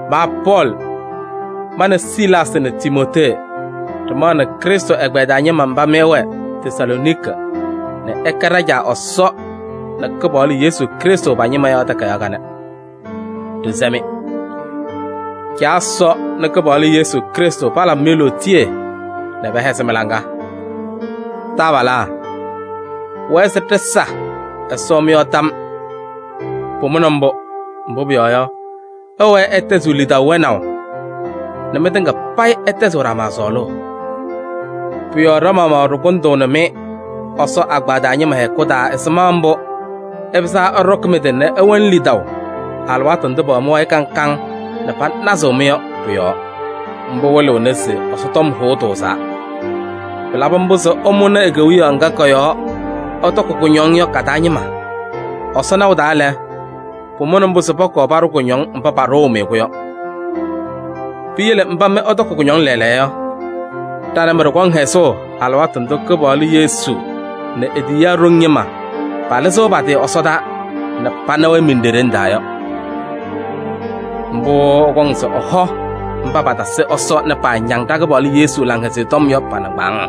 Ma Pɔɔlɩ, ma nɛ Silaasɩ nɛ Timootee ɖɩmaɣnɩ Krɩstʋ ɛgbɛyɛ taa ñɩma mba mɩ ɩwɛ Tesalooniki nɛ ɩkɛ ɖa-Caa Ɛsɔ nɛ Kɩpaɣlʋ Yesu Krɩstʋ pa-ñɩma yɔ takayaɣ kanɛ. Ɖɩsɛ-mɩ: Caa Ɛsɔ nɛ Kɩpaɣlʋ Yesu Krɩstʋ palabɩ-mɩ lootiye nɛ pɛhɛzɩ mɩ-laŋa. Taabalaa! Pʋwɛɛ se ɖɩsa Ɛsɔ mɩ-yɔɔ tam. Pʋmʋna mbʋ, mbʋ pʋyɔɔ yɔ, ɩwɛɛ ɩtɛzɩɣ lidaʋ wɛnaʋ nɛ mɩtɩŋa payɩ ɩtɛzɩɣ ɖama sɔɔlʋʋ. Pʋ-yɔɔ ɖa-maɣmaɣ ɖɩkʋndʋʋnɩ-mɩ Ɛsɔ agbaa taa ñɩma hɛkʋ taa ɛzɩma mbʋ ɩpɩzaa ɩɖɔkɩ mɩ-tɩ nɛ ɩwɛnɩ lidaʋ alɩwaatʋ ndʋ pɛwɛ mɩ-wayɩ kaŋ kaŋ nɛ panazɩɣ-mɩ yɔ pʋ-yɔɔ. Mbʋ wɩlɩɣnɩ se Ɛsɔ tɔm hʋʋ tʋʋzaa. Pɩlabɩ mbʋ se ɩmʋnɩ e-Kewiyaɣ ŋga kɔ-yɔɔ ɩtɔkɩ kʋñɔŋ yɔ ka-taa ñɩma. Ɛsɔ naʋ taa lɛ, pʋmʋna mbʋ se pɔkɔɔ paɖʋ kʋñɔŋ mba paɖʋʋ-mɩ-kʋ yɔ. Piyele mba mɩ ɩtɔkɩ kʋñɔŋ lɛɛlɛɛyɔ yɔ, ɖa nɛ mɩ ɖɩkɔŋ hɛzʋʋ alɩwaatʋ ndʋ Kɩpaɣlʋ Yesu nɛ e-tiyiyaa ɖoŋ ñɩma palɩzɩɣ pa-tɩ ɛsɔdaa nɛ pana-wɛ miɖeɖeŋ taa yɔ. Mbʋ ɛkɔŋ se ɛhɔ mba patasɩ Ɛsɔ nɛ paañaŋ ɖa-Kɩpaɣlʋ Yesu Laŋhɛzɩyɛ Tɔm yɔ pa-nɩŋgbaaŋ.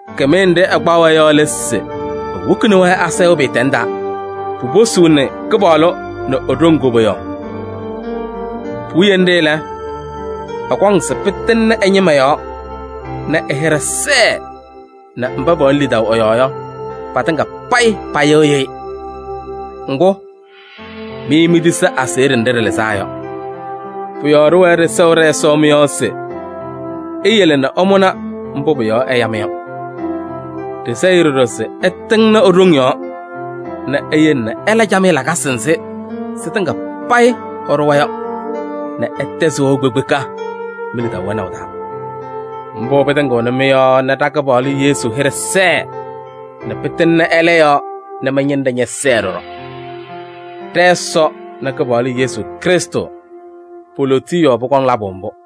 Kɩmɩyɛ nɖɩ ɛkpaɣ-wɛ yɔ lɛ se ewokini-wɛ asayʋʋ pɩɩtɛŋ taa, puposuuni Kɩpaɣlʋ nɛ e-ɖoŋ koboyaɣ. Puwiye nɖɩ lɛ, ɛkɔŋ se pɩtɩŋnɩ ɛ-ñɩma yɔɔ nɛ ɛ-hɩɖɛ sɛɛ nɛ mba pɛwɛnɩ lidaʋ ɛ-yɔɔ yɔ, patɩŋa payɩ payɩɣyɩ-ɩ. Ŋgʋ, mɩ mitisi aseɣɖe nɖɩ ɖɩlɩzaa yɔ. Pʋ-yɔɔ ɖɩwɛɛ ɖɩsɛɣ ɖɛ-Ɛsɔ mɩ-yɔɔ se eyele nɛ ɩmʋnɩ mbʋ pʋ-yɔɔ ɛya-mɩ yɔ. Ɖɩsɛɣ-ɩ ɖɔɖɔ se ɛtɩŋnɩ e-ɖoŋ yɔɔ nɛ eyele ɩla camɩyɛ lakasɩ nzɩ sɩtɩŋa payɩ ɩɖʋwa yɔ nɛ ɩtɛzɩ wɛʋ kpekpeka mi-lidaʋ wɛnaʋ taa. Mbʋ pɩtɩŋɩɣnɩ mɩ-yɔɔ nɛ ɖa-Kɩpaɣlʋ Yesu hɩɖɛ sɛɛ nɛ pɩtɩŋnɩ ɛlɛ yɔɔ nɛ mɩ-ñɩnɖɛ ñɛsɛɛ ɖɔɖɔ. Ɖɛ-Ɛsɔ nɛ Kɩpaɣlʋ Yesu Krɩstʋ, po-lootiye yɔɔ pʋkɔŋ pɩla mbʋ.